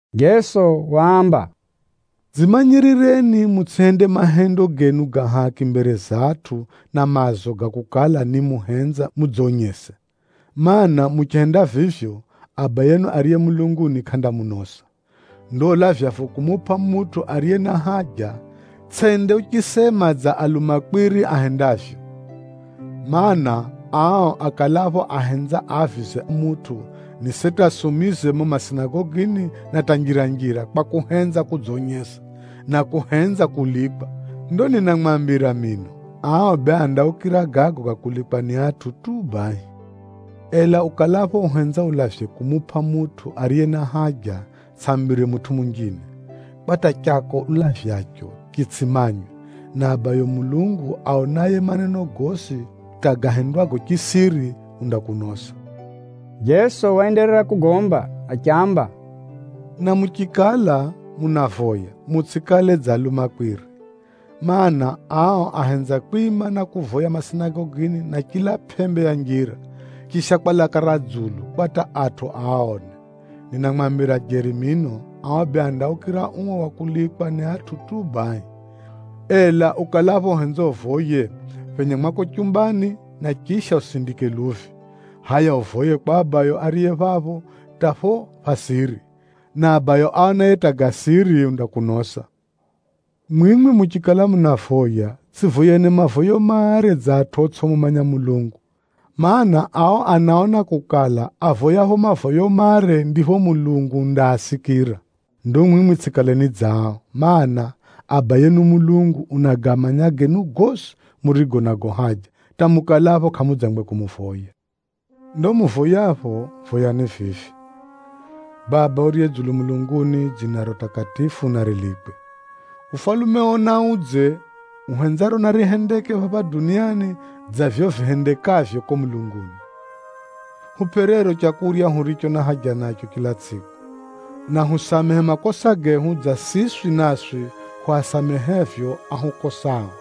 Jeso waamba, “Dzimanyirireni mutsʼihende mahendo genu ga haki mbere za atʼu na maazo ga kukala ni muhenza mudzonyese. Maana, muchihenda vivyo, Abayenu ariye mulunguni kʼandamunosa. “Ndo ulavyapho kumupʼa mutʼu ariye na haja, tsʼende uchisema dza alumakwiri ahendavyo. Maana, ao akalapho ahenza aavize mutʼu, ni seti asumize mumo masinagogini na hata njira-njira kwa kuhenza kudzonyesa, na kuhenza kulikwa. Ndo ninamwambira jeri mino, ao bee andaukira gago ga kulikwa ni atʼu tu bahi. Ela ukalapho uhenza ulavye kumupʼa mutʼu ariye na haja, tsʼambire mutʼu munjine, kwa hata chako ulavyacho chitsʼimanywe, na Abayo Mulungu aonaye maneno gosi hata gahendwago chisiri, undakunosa.” Jeso waenderera kugomba achiamba, “Na muchikala munavoya, mutsʼikale dza alumakwiri. Maana, ao ahenza kwima na kuvoya masinagogini na chila pʼembe ya njira, chisha kwa laka ra dzulu kwa hata atʼu aaone. Ninamwambira jeri mino, ao bee andaukira uo wa kulikwa ni atʼu tu bahi. Ela ukalapho uhenza uvoye, phenya mwako chumbani, na chisha usindike luvi, hʼaya uvoye kwa Abayo ariye phapho hata phapho pha siri, na Abayo aonaye hata ga siri undakunosa. Mwimwi muchikala munavoya, tsʼivoyeni mavoyo mare dza atʼu otsʼimumanya Mulungu. Maana, ao anaona kukala, avoyapho mavoyo mare ndipho Mulungu undaasikira. Ndo mwimwi tsʼikaleni dza ao, mana, Abayenu Mulungu unagamanya genu gosi murigo nago haja hata mukalapho kʼamudzangwe kumuvoya. Ndo muvoyapho, voyani vivi: ‘Baba uriye dzulu mulunguni, dzinaro takatifu narilikwe, ufalumeo naudze: uhenzaro narihendeke phapha duniani dza vivyo vihendekavyo kuko mulunguni. Hupʼe rero leu huriro huna haja naro chila tsʼiku. Na husamehe makosa gehu, dza vivyo siswi naswi hwasamehevyo ahukoserao.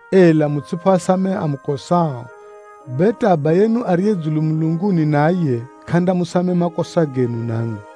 Ela mutsʼiphoasamehe amukosao, bee hata Abayenu ariye dzulu mulunguni naye, kʼandamusamehe makosa genu namwi.”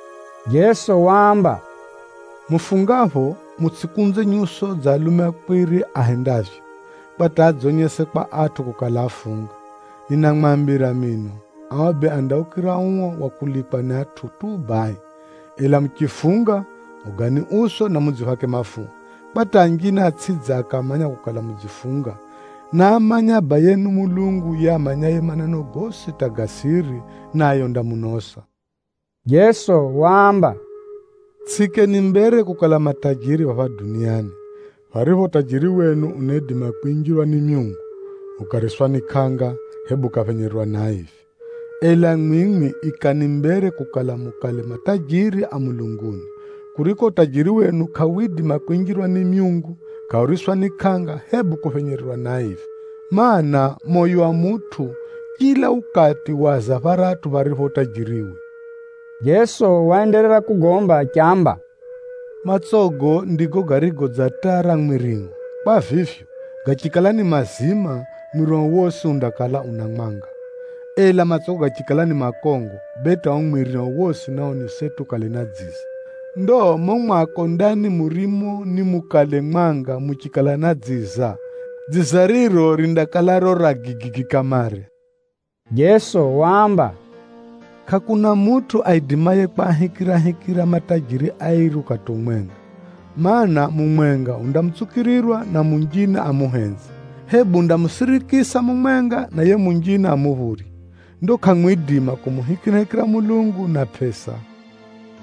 Jeso waamba, “Mufungapho, mutsʼikunze nyuso dza alumakwiri ahendavyo, kwa hata adzonyese kwa atʼu kukala afunga. Ninamwambira jeri mino, ao bee andaukira uo wa kulikwa ni atʼu tu bahi. Ela muchifunga, ogani uso, na mudziphake mafuha, kwa hata anjine atsʼidze akamanya kukala mudzifunga. Naamanye Abayenu Mulungu yiye amanyaye maneno gosi hata ga siri, naye undamunosa.” Jeso waamba, “Tsʼiikeni mbere kukala matajiri phapha duniani, pharipho utajiri wenu unaidima kwinjirwa ni myungu, ukariswa ni kʼanga, hebu ukaphenyererwa ni aivi. Ela mwimwi ikani mbere kukala mukale matajiri a mulunguni, kuriko utajiri wenu kʼawidima kwinjirwa ni myungu, kʼauriswa ni kʼanga, hebu kuphenyererwa ni aivi. Maana, moyo wa mutʼu chila ukati waza pharatʼu pharipho utajiriwe.” Jeso waenderera kugomba achiamba, “Matsogo ndigo garigo dza taa ra mwirio. Kwa vivyo, gachikala ni mazima, mwirio wosi undakala una mwanga. Ela matsogo gachikala ni makongo, bee hata ao mwirio wosi nao ni seti ukale na dziza. Ndo mumo mwako ndani murimo nimukale mwanga muchikala na dziza, dziza riro rindakala riro ra gigigi kamare.” Jeso waamba, “Kʼakuna mutʼu aidimaye kwahikirahikira matajiri airi ukati umwenga. Maana, mumwenga undamutsukirirwa na munjine amuhenze, hebu undamusirikisa mumwenga, na yiye munjine amuphurye. Ndo kʼamwidima kumuhikirahikira Mulungu na pʼesa.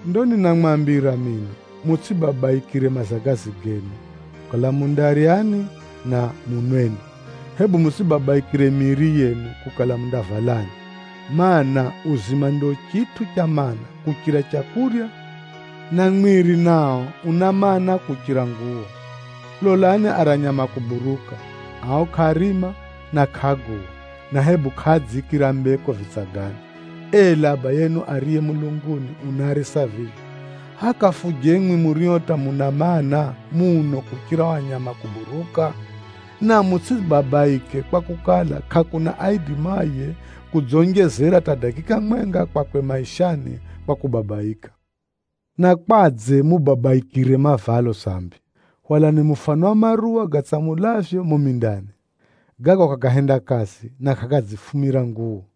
“Ndo ninamwambira mino, mutsʼibabaikire mazagazi genu, kukala mundaryani na munweni, hebu mutsʼibabaikire miiri yenu, kukala mundavalani. Maana, uzima ndio chitʼu cha maana, kuchira leu, na mwiri nao una maana, muno kuchira nguwo. Lolani ara nyama a kuburuka. Ao kʼaarima na kʼaaguwa, na hebu kʼaadziikira mbeko vitsagani, ela Abayenu ariye mulunguni unaarisa vivyo. Hʼaya kafuje mwimwi murio hata muna maana muno kuchira ao nyama a kuburuka? Na mutsʼibabaike kwakukala, kʼakuna aidimaye kudzonjezera hata dakika mwenga kwakwe maishani kwa kubabaika. Na kwadze mubabaikire mavalo sambi? Hwalani mufano wa maruwa gatsamulavyo mumo mindani. Gago kʼagahenda kazi, na kʼagadzifumira nguwo.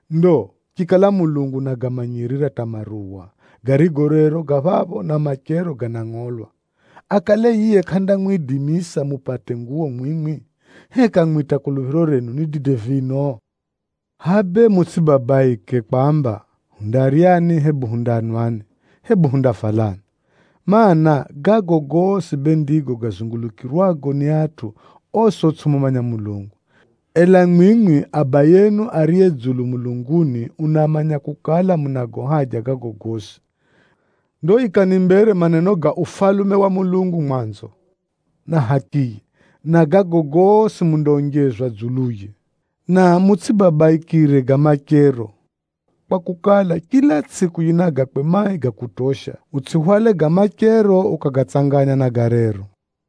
Ndo chikala Mulungu unagamanyirira hata maruwa, garigo rero ga phapho na machero ganangʼolwa, akale yiye kʼandamwidimisa mupate nguwo mwimwi? Heka mwimwi hata kuluphiro renu ni dide vino? Hʼaya bee mutsʼibabaike kwamba, ‘Hundaryani?’ Hebu ‘Hundanwani?’ Hebu ‘Hundavalani?’ Maana, gago gosi bee ndigo gazungulukirwago ni atʼu osi otsʼimumanya Mulungu. Ela mwimwi Abayenu ariye dzulu mulunguni unamanya kukala, munago haja gago gosi. Ndo ikani mbere maneno ga Ufalume wa Mulungu mwanzo, na hakiye, na gago gosi mundaonjezwa dzuluye. Na mutsʼibabaikire ga machero kwakukala, chila tsʼiku yina gakwe mai ga kutosha. Utsʼihwale ga machero ukagatsanganya na ga rero.”